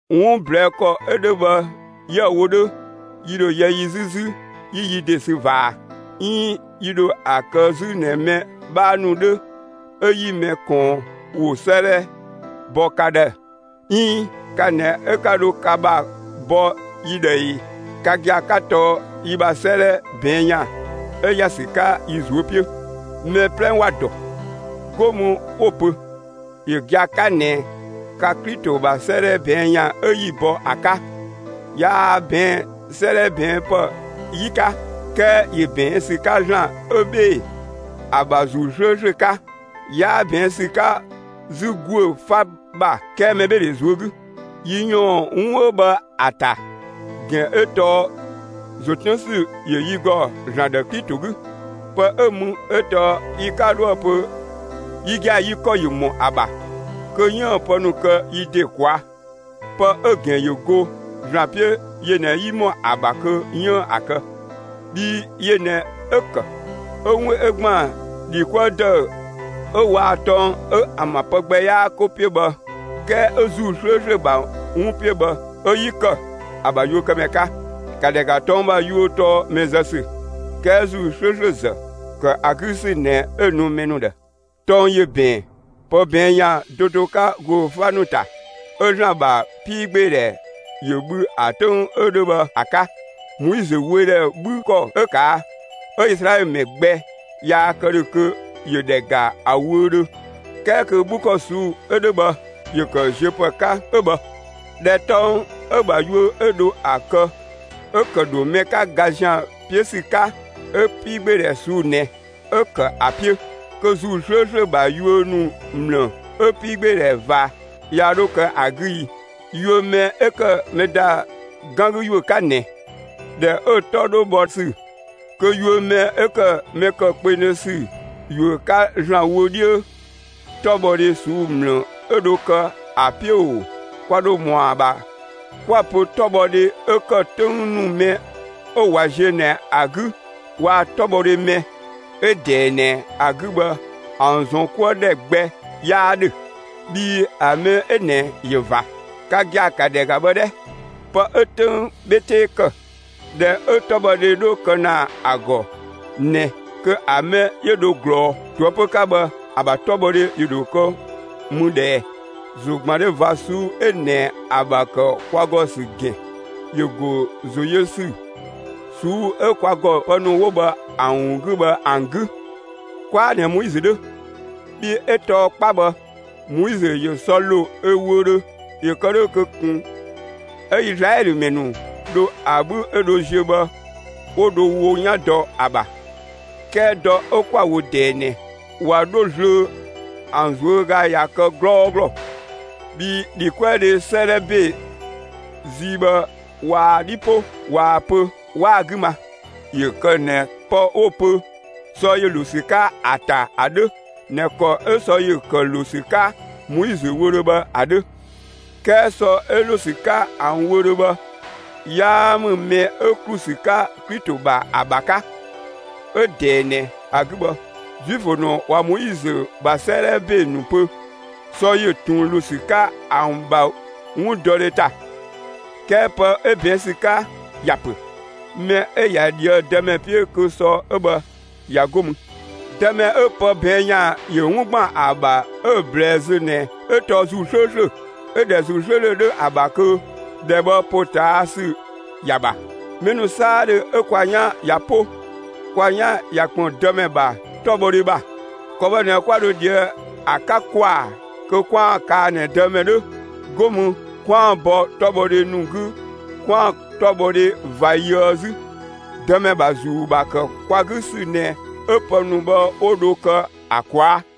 'Wun ꞊blɛɛ' ‑kɔ 'ö 'dhö bhë 'yië‑ wo 'dhö, yi ‑dho yɛ yi 'zü 'zü 'yi yi ‑de sü ꞊va ꞊a? 'Iin yi ‑dho ‑a kë 'zü ꞊nɛ mɛ 'bhaa ‑nu 'dhö, 'ö 'yi mɛ ꞊kɔɔn ‑wo 'sëëdhɛ bɔ ka ‑dhë, 'iin 'ka ꞊nɛ 'ö 'ka dho ka ‑bha bɔ yi ‑dhë ꞊ee? Ka gia‑ 'ka tɔɔ yi ‑bha 'sëëdhɛ ꞊bɛɛn' ‑yan 'ö ‑ya ‑sü 'ka yi ꞊zuö' 'piö; mɛ 'plɛ ‑wa ‑dɔ, 'go mü 'wo‑ pö; ‑yö gia‑ 'ka ꞊nɛ ka Klito ‑bha 'sëëdhɛ ꞊bɛɛn' ‑yan 'ö 'yi‑ bɔ ‑a 'ka. Yaa ꞊bɛɛn'‑ 'sëëdhɛ ꞊bɛɛn' ‑pë 'yi 'ka, 'kɛɛ ‑yö ꞊bɛɛn' ‑sü 'ka ‑Zlan 'ö 'bhee‑ ‑a ‑bha ‑Zuu 'slööslö 'ka. 'Yaa ꞊bɛɛn' ‑sü 'ka 'zü ‑guö 'fa ‑bha 'kɛɛ mɛbheedhe ꞊zuö' 'gü. Yi ‑yɔɔn 'wun 'ö bhë ‑a ‑ta ‑gɛn 'ö tɔɔ ‑zo 'tën ‑sü ‑yö yi ‑gɔ ‑Zlan ‑dhë Klito 'gü. Pë 'ö mü 'ö tɔɔ yi 'ka 'dhoë‑ pö yi gia‑ yi ‑kɔ ‑yö ‑mɔ ‑a ‑bha kö 'yiën‑ pë ‑nu kë yi ‑de ꞊kwaa'. Pë 'ö‑ ‑gɛn ‑yö go ‑Zlan 'piö yö ꞊nɛ 'yi ‑mɔ ‑a ‑bha kö 'yiën‑ ‑a kë. Bhii yö ꞊nɛ 'ö‑ ‑kë 'ö 'wun 'ö ‑gban ‑dhi 'kuë ‑dëü 'ö waa‑ tɔng 'ö ‑an ‑bha pë gbɛ 'yaa 'ko 'piö bhë, 'kɛɛ 'ö ‑Zuu 'slööslö ‑bha 'wun 'piö bhë 'ö 'yi ‑kë ‑a ‑bha yuökëmɛ 'ka. ‑Ka ‑dhɛ ‑ga, tɔng ‑bha yuö tɔɔ mɛ zë ‑sü; 'kɛɛ ‑Zuu 'slööslö ‑zë, ‑kë ‑a 'gü ‑sü ꞊nɛ 'ö‑ nu mɛ ‑nu ‑dhë. Tɔng ‑yö ‑bɛɛn pë ꞊bɛɛn' ‑yan do do 'ka ‑guö 'fa ‑nu ‑ta, 'ö ‑Zlan ‑bha 'piigbeedhɛ ‑yö bhü ‑a 'töng 'ö 'dhö bhë ‑a 'ka; Moizö wöödhɛ 'bhü ‑kɔ 'ö ꞊kaa', 'ö Izlaɛlö ‑mɛ gbɛ yaa kë ‑dhö kö ‑yö ‑dhɛ ‑ga ‑a wöödhö, 'kɛɛ kö 'bhü ‑kɔ ꞊suu'‑ 'ö 'dhö bhë ‑yö kë ziö ‑pë 'ka 'ö bhë. ꞊Dhɛ tɔng 'ö‑ ‑bha yuö 'ö dho ‑a kë 'ö ‑kë ‑dho mɛ 'ka ga ‑zian 'piö ‑sü 'ka 'ö 'piigbeedhɛ ꞊suu'‑ ꞊nɛ 'ö ‑kë ‑a 'piö, kö ‑Zuu 'slööslö ‑bha yuö ‑nu ‑mlë 'ö 'piigbeedhɛ ꞊va yaa 'dho kë ‑a 'gü i! Yuö mɛ 'ö ‑kë mɛ ‑da 'gan 'gü ‑yuö 'ka ꞊nɛ, ꞊dhɛ 'ö‑ 'tɔ 'dho bhɔ ‑sü, kö yuö mɛ 'ö ‑kë mɛ ‑kë kpengdhö ‑sü ‑yuö 'ka ‑Zlan wö 'dhiö, 'tɔbhɔdhe ꞊suu'‑ ‑mlë 'ö dho kë ‑a 'piö ‑oo! Kwa ‑dho ‑mɔa ‑bha 'kwa‑ pö 'tɔbhɔdhe 'ö ‑kë 'töng ‑nu mɛ 'ö ꞊wa ziö ꞊nɛ ‑a 'gü waa‑ 'tɔbhɔdhe mɛ 'ö ꞊dɛɛ ꞊nɛ ‑a 'gü bhë ‑an ‑zɔn 'kuë ‑dhɛ gbɛ 'yaa 'dhö, bhii ‑a mɛ 'ö ꞊nɛ ꞊yö ꞊va. Ka gia‑ ‑ka ‑dhɛ ‑ga bhë 'dhɛ! Pë 'ö 'töng 'bhe 'tee ‑kë, ꞊dhɛ 'ö 'tɔbhɔdhe 'dhö ‑kë ‑na ‑a ‑gɔ ꞊nɛ, kö ‑a mɛ 'yö dho ꞊glɔɔ ꞊toëpö 'ka bhë ‑a ‑bha 'tɔbhɔdhe ‑yö ‑dho kë mü ꞊dhë ꞊ɛɛ? ‑Zogbandhe ꞊va ꞊suu'‑ 'ö ꞊nɛ ‑a ‑bha ‑kë kwa ‑gɔ ‑sü ‑gɛn ‑yö ‑go ‑zoyösü ꞊suu'‑ 'ö kwa ‑gɔ pë ‑nu 'wo bhë ‑an ‑wun 'gü bhë ‑an 'gü. 'Kwaa ꞊nɛ Moizö 'dhö. Bhii 'ö tɔɔ 'kpa bhë, Moizö ‑yö sɔ ‑lo ö wöödhö ‑yö kë 'dhö kö ꞊kun 'ö Izlaɛlö ‑mɛ ‑nu dho ‑a 'bhü 'ö dho ‑ziö bhë 'wo dho wo 'yan dɔ ‑a ‑bha. 'Kɛɛ dɔ 'ö 'kwa‑ wo ꞊dɛɛ ꞊nɛ ꞊wa 'dho zlöö ‑an ꞊zuöga ꞊ya kë 'glɔɔglɔ. Bhii ‑dhikuëdhe 'sëëdhɛ ‑be zii bhë ꞊waa‑ 'dhi 'po, ꞊waa‑ pö, 'waa‑ 'gü ma. ‑Yö kë ꞊nɛ pë 'wo‑ pö sɔ ‑yö ‑lo ‑sü 'ka ‑a ‑ta ‑a 'dhö ꞊nɛ ‑kɔ 'ö sɔ ‑yö ‑kë ‑lo ‑sü 'ka Moizö wöödhö bhë ‑a 'dhö. 'Kɛɛ sɔ 'ö ‑lo ‑sü 'ka ‑an wöë‑ bhë, 'yaa ‑mü mɛ 'ö ‑klu ‑sü 'ka Klito ‑bha ‑a ‑bha 'ka. 'Ö ꞊dɛɛ ꞊nɛ ‑a 'gü bhë, Zuifö ‑nu ꞊wa Moizö ‑bha 'sëëdhɛ ‑be ‑nu pö, sɔ ‑yö ꞊tun ‑lo ‑sü 'ka ‑an ‑bha 'wundɔdhe ‑ta. 'Kɛɛ pë 'ö ꞊bɛɛn' ‑sü 'ka ‑ya ‑pö: Mɛ 'ö ꞊ya ꞊dhië'‑ Dëmɛ 'piö kö sɔ 'ö bhë ꞊ya 'go mü. Dëmɛ 'ö pë ꞊bɛɛn' ‑yan ‑yö 'wun ‑gban ‑a ‑bha 'ö‑ ꞊blɛɛ zö ꞊nɛ 'ö tɔɔ ‑Zuu 'slööslö, 'ö ‑dhɛ ‑Zuu 'slööslö 'dhö ‑a ‑bha kö ‑dhɛ bhë ‑potaasü ‑ya ‑bha. Mɛ ‑nu 'saadhö 'ö kwa 'yan ꞊ya 'po, kwa 'yan ꞊ya ‑kpën Dëmɛ ‑bha 'tɔbhɔdhe ‑bha; ‑kɔ bhë ꞊nɛ 'kwa dho ꞊dhië'‑ ‑a 'ka ‑kwaa kö 'kwaan‑ kaa ꞊nɛ Dëmɛ 'dhö, 'go mü 'kwaan‑ bɔ 'tɔbhɔdhe ‑nu 'gü 'kwaan‑ 'tɔbhɔdhe ꞊va yöë 'zü. Dëmɛ ‑bha ‑Zuu ‑bha ‑kë kwa 'gü ‑sü ꞊nɛ 'ö pë ‑nu bhë 'wo dho kë ‑a ꞊kwaa'.